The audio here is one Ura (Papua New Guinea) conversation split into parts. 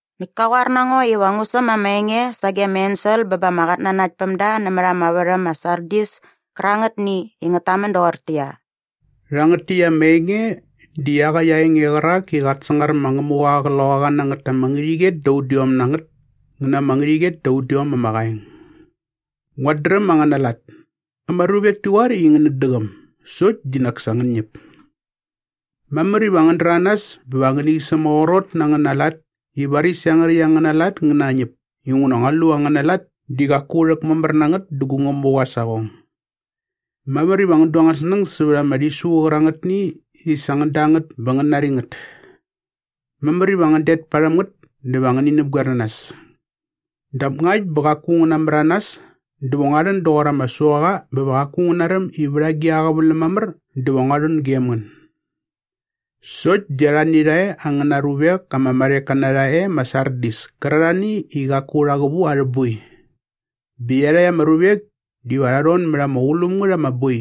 Näkt ka qoar na ngo iva ngu säm ama enge sage ama ensel bä ba ama qatnanaktpämda nämät ama värhäm ma Sardis kärangätni i ngät tamän doqortäqyia, “Rhangät täkt ama enge di iaqäkt aa enge qärak i qat sangar ma Ngämuqa aa qloqaqanangät ama ngärhäqyet da udiom na ngät ngä na ama ngärhäqyet da udiom ama qaeng. “Nguat dräm angäna lat. Ama ruvek ti qoar i ngänät däqäm sokt di nak sa ngän ñäp. Mamär iva ngän däranas bä va ngäni sämaqrot na angäna lat i varis iangärhäkt angäna lat ngä nañäp inguna ngua lu i angäna lat di qaku rhäkmamär na ngät dä gu Ngämuqa aa saqong. Mamär iva ngän du angän snäng sävät ama rhisu qärangätni i sa ngän da ngät bä ngän nari ngät. Mamär iva ngän det parhäm ngät dä va ngäni näpqoer na nas. Dap ngakt bä qaku ngän namäranas dä va ngua rhän doqor ama suaqa bä va qaku ngän naräm i vät agi a qäväläm mamär dä va ngua rhän gem ngän. “Sokt di arhani rha e angäna ruvek ama marheka na rha e ma Sardis kärarhani i qaku rha qävu arhä boi. Bä iarhakt ama ruvek diva rha rhon mät ama qulum ngät ama boi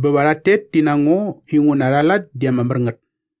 bä va rhat tet ti na ngo inguna arha lat di ama mär ngät.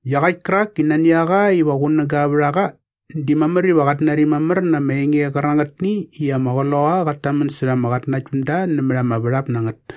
“Iaqäkt kärak i nani a qa iva qunäga vät a qa di mamär iva qat nari mamär na ama enge qärangätni i ama Qloqaqa qat tamän särha ama qatnanaktpämda nämät ama värhap na ngät.”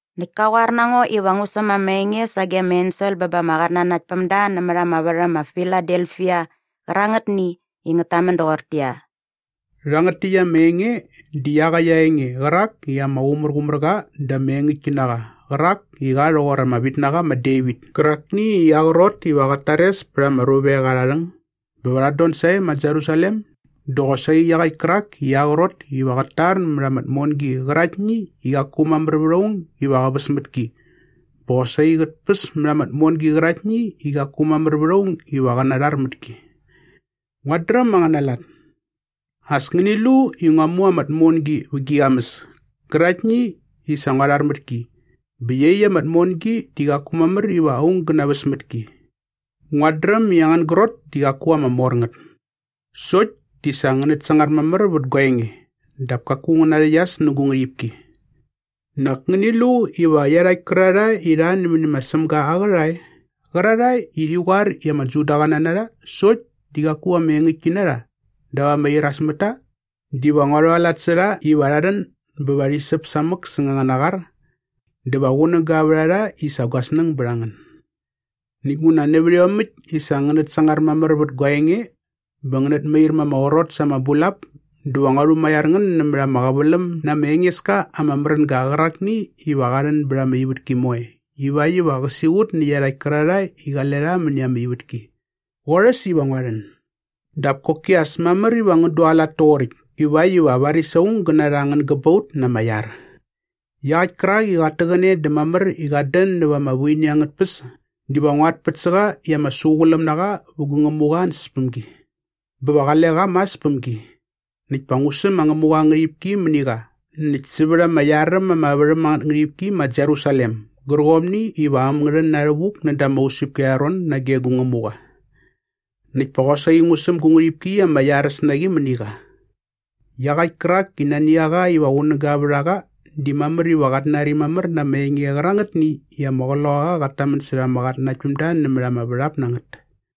Näkt ka qoar na ngo iva ngu säm ama enge sage ama ensel bä ba ama qatnanaktpämda nämät ama värhäm ma Filadelfia qärangätni i ngät tamän doqortäqyia, “Rhangät täkt ama enge di iaqäkt aa enge qärak i ama qumärqumär qa dä ama engäktki na qa qärak i qa rhoqor ama vitnaqa ma Devit kärakni i aa qrot iva qat tares pät ama ruvek arha rhäng bä va rhat don sae ma Jerusalem dä qosaqi iaqäkt kärak i aa qrot iva qät tar mät ama tmongi qäraktni i qaku mamär vät aung iva qä väs mät ki bä qosaqi qät päs mät ama tmongi qäraktni i qaku mamär vät aung iva qä rhar mät ki. “Nguat dräm angäna lat. As ngäni lu i ngua mu ama tmongi vä gi qamäs käraktni i sa ngua rhar mät ki bä iaqyäkt ama tmongi di qaku mamär iva aung gä naväs mät ki. Nguat dräm i angän grot di qaku ama mor ngät. Sokt di sa ngänät sangar mamär vät gua enge dap kaku ngän narhäqyas nä gu ngärhipki. Nak ngäni lu iva iarhakt kärarhae i rha nämäni ma Sämga aa qärhae qärarhae i rhi qoar i ama Judaqäna na rha sokt di qaku engäktki na rha dap ama iras mät ta diva ngua rhualat sä rha iva rha rhän bä va rhi säp samäk säng angäna qar dä va qunäga vät a rha i sa gua snäng bät a ngän. “Näkt nguna nävät iomäkt i sa ngänät sangar mamär vät gua enge bä ngänät mair ma ama qrot sa ama bulap dä va ngua rhumaiar ngän nämät ama qäväläm na ama enges ka ama märänga qärakni iva qa rhän bät ama ivätki moe ivakt iva qä siqut nä iarhakt kärarhae i qale rha mäni ama ivätki. Qorhäs iva ngua rhän. Dap koki as mamär iva ngän dualat toqoräkt ivakt iva varis aung gä narha angän gäbaut na ama iar. “Iaqäkt kärak i qat täqäne dä mamär i qat dän näva ama vuini angät tpäs diva nguat pät sä qa i ama suquläm na qa vä gu Ngämuqa aa ansäspämgi. Bä va qale qa mas päm gi. Näkt pa ngu säm ma Ngämuqa aa ngärhipki mäni qa näkt sävät ama iar äm ama värhäm angät ngärhipki ma Jerusalem gärqomni iva äm ngä rhän na rhävuk näda ama usäpki arha ron nage gu Ngämuqa. Näkt pa qosaqi ngu säm gu ngärhipki ama iaräs na qi mäni qa. Iaqäkt kärak i nani a qa iva qunäga vät a qa di mamär iva qat nari mamär na ama enge qärangätni i ama Qloqaqa qat tamän särha ama qatnanaktpämda nämät ama värhap na ngät.”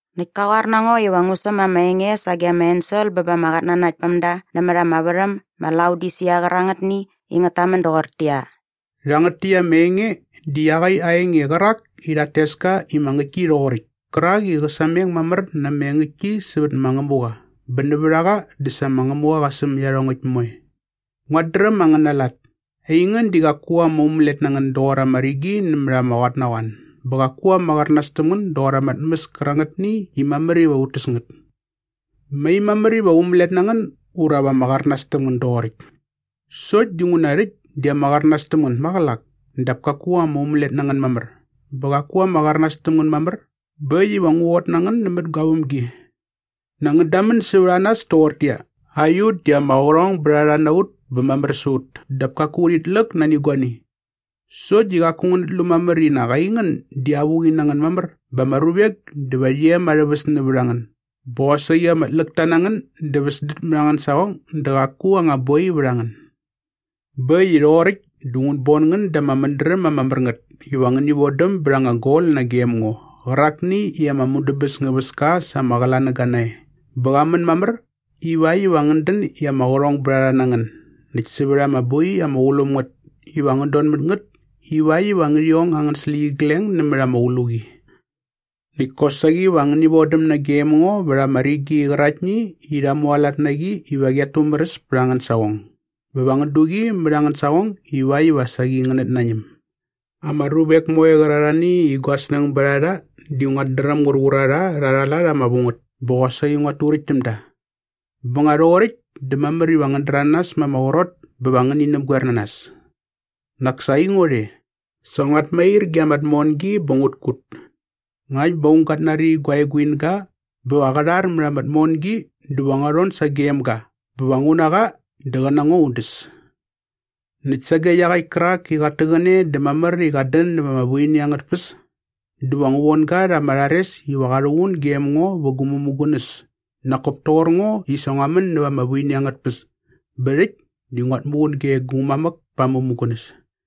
Näkt ka qoar na ngo iva ngu säm ama enge sage ama ensel bä ba ama qatnanaktpämda nämät ama värhäm ma Laodisia qärangätni i ngät tamän doqortäqyia, “Rhangät täkt ama enge di iaqäkt aa enge qärak i rhat tes ka i ma Ngäktki Rhoqoräkt kärak i qä sameng mamär na ama engäktki sävät ma Ngämuqa bä nävät a qa dä sa ma Ngämuqa qa säm iarhongäkt moe. “Nguat dräm angäna lat. Aingän di qaku ama umälet na ngän doqor ama rigi nämät ama qotnaqoan bä qaku ama qärnas täm ngän doqor ama tmäs kärangätni i mamär iva ut täs ngät. Mai mamär iva ama umälet na ngän ura va ama qärnas täm ngän doqoräkt. Sokt dinguna rhäkt di ama qärnas täm ngän maqälak dap kaku ama umälet na ngän mamär bä qaku ama qärnas täm ngän mamär bä äkt iva ngu qot na ngän nämät gua vämgi. Nak ngän damän sävät a nas toqortäqyia, ‘Aiut di ama qärhongbärharha na ut bä mamär sä ut dap kaku urhit läk nani guani.’ Sokt di qaku ngänät lu mamär i nak aingän di avuqi na ngän mamär bä ama ruvek diva rhi em arhä väs nävät a ngän bä qosaqi ama tläkta na ngän dä väsdät mät angän saqong dä qaku anga boi vät a ngän. “Bä äkt i rhoqoräkt dä ngut bon ngän da ama mädräm ama mär ngät iva ngäni vodäm bät anga gol nagem ngo qärakni i ama mudäbäs ngä väs ka sa ama qlanäga nae bä qa män mamär iväkt iva ngän dän i ama qärhongbärharha na ngän näkt sävät ama boi ama qulum ngät iva ngän don mät ngät ivakt iva ngärhi ong angän släqyigleng nämät ama qluqi. Näkt kosaqi va ngäni vodäm nagem ngo vät ama rigi qäraktni i rha mualat na qi iva qiat tumäräs pät angän saqong bä va ngän du qi mät angän saqong ivakt iva saqi ngänät nañäm. “Ama ruvek moe qärarhani i gua snäng bät a rha di nguat dräm ngur qur a rha rha arha lat ama vu ngät bä qosaqi nguat turäkt täm da. Bä nga rhoqoräkt dä mamär iva ngän däranas ma ama qrot bä va ngäni näpgoer na nas. Nak sa aingo rhe. Sa nguat mair ge ama tmongi bä ngut kut. Ngakt bä aung gat nari gua eguinga bä va qä rhar mät ama tmongi dä va ngua rhon sagem ga bä va ngu na qa dä qä na ngo un däs. Näkt sage iaqäkt kärak i qat täqäne dä mamär i qat dän näva ama vuini angät tpäs dä va ngu von ga rha ama rhares iva qa rhuqun gem ngo vä gu mämugunäs nak kop toqor ngo i sa ngua män näva ama vuini angät tpäs bä rhäkt di nguat muqun ge gu mamäk pa aa mämugunäs.